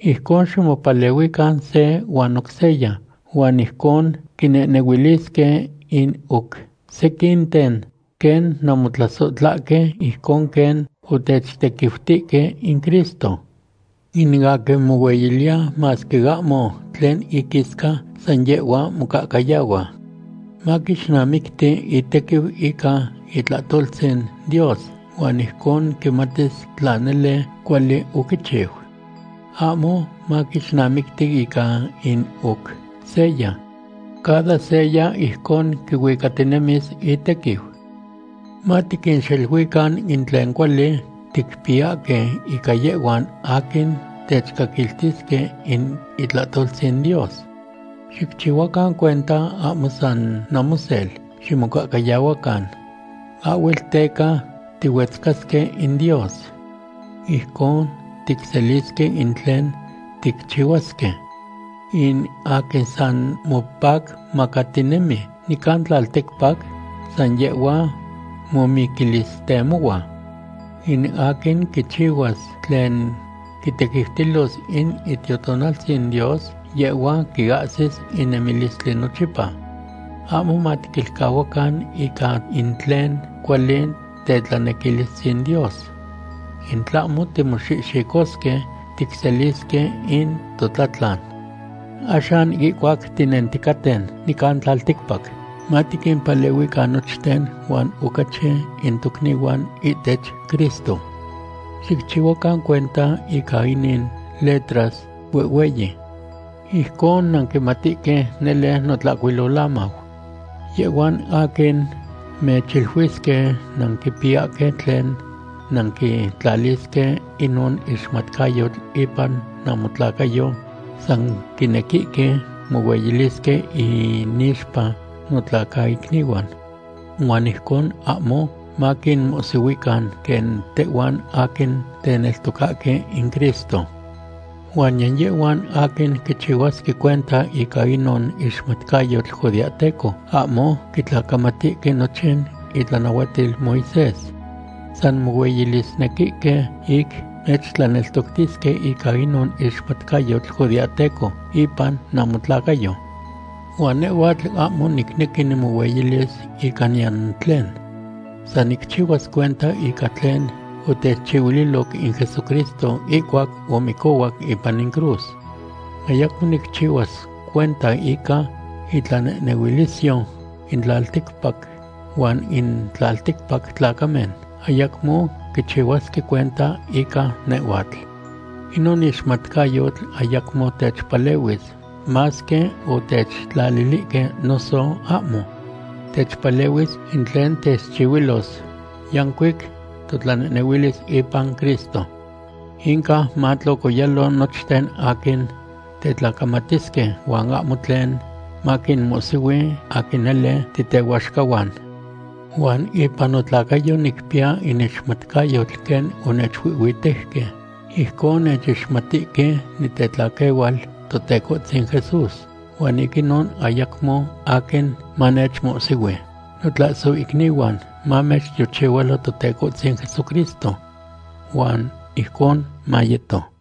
Ijcon ximopalehuican se huan oc seya, huan ijcon quinehnehuilisque in oc sequinten quen nanmotlasohtlahque ijcon quen otechtequiutihque in Cristo. In aquin mohueyiliya masque ahmo tlen iquisca, san yehhua mocahcayahua. Maquixnamicti itequiu ica itlahtoltzin Dios huan ijcon quimatis tla nele cuali oquichiu. Ahmo maquixnamicti ica in oc seya. Cada seya ijcon quihuicatinemis itequiu. Matiquinxeluican in tlen cuali ticpiyahque ica yehhuan aquin techcaquiltisque in itlahtoltzin Dios. Xicchihuacan cuenta ahmo san namosel ximocahcayahuacan. Ahhuel teca tihuetzcasque in Dios. Ijcon ticselisque in tlen ticchihuasque. In aquin san mopacmacatinemi nican tlalticpac, san yehhua momiquilistemohua. In aquin quichihuas tlen quitequiutilos in Itiotonaltzin Dios, yehhua quiahsis in nemilistli nochipa. Ahmo matiquilcahuacan ica in tlen cuali tetlanequilistzin Dios. In tlahmo timoxihxicosque, ticselisque in totlatlan. Axan ihcuac tinenticaten nican tlalticpac, matiquimpalehuican nochten, huan ocachi in tocnihuan ihtech Cristo. Xicchihuacan cuenta ica inin letras huehhueyi. Ijcon nanquimatihque nele notlahcuilolamau. Yehhuan aquin mechiluisque nanquipiyahque tlen nanquitlalisque inon ixmatcayotl ipan namotlacayo san quinequihque mohueyilisque inixpa notlacaicnihuan. Huan ijcon ahmo maquinmohsihuican quen tehhuan aquin teneltocahque in Cristo. Huan niyan yehhuan aquin quichihuasque cuenta ica inon ixmatcayotl judeahteco ahmo quitlacamatihque nochin itlanahuatil Moisés. San mohueyilisnequihque ic mechtlaneltoctisque ica inon ixmatcayotl judeahteco ipan namotlacayo. Huan nehhuatl ahmo nicnequi nimohueyilis ica niyan tlen. San nicchihuas cuenta ica tlen otechchihuililoc in Jesucristo ihcuac omicohuac ipan in cruz. Ayacmo nicchihuas cuenta ica itlanehnehuilisyo in tlalticpac huan in tlalticpac tlacamen ayacmo quichihuasque cuenta ica nehhuatl. Inon ixmatcayotl ayacmo techpalehuis, masque otechtlalihque noso ahmo. Techpalehuis in tlen techchihuilos yancuic totlanehnehuilis ipan Cristo. Inca matlocoyalo nochten aquin tetlacamatisque huan ahmo tlen maquinmohsihui aquin nele titehuaxcahuan. Huan ipan notlacayo nicpiya in ixmatcayotl quen onechuihhuitejque, ijcon nechixmatihque nitetlaquehual Totecohtzin Jesús, huan ic inon ayacmo aquin manechmohsihui. Notlasohicnihuan, mamechtiochihualo Totecohtzin Jesucristo. Huan ijcon mayeto.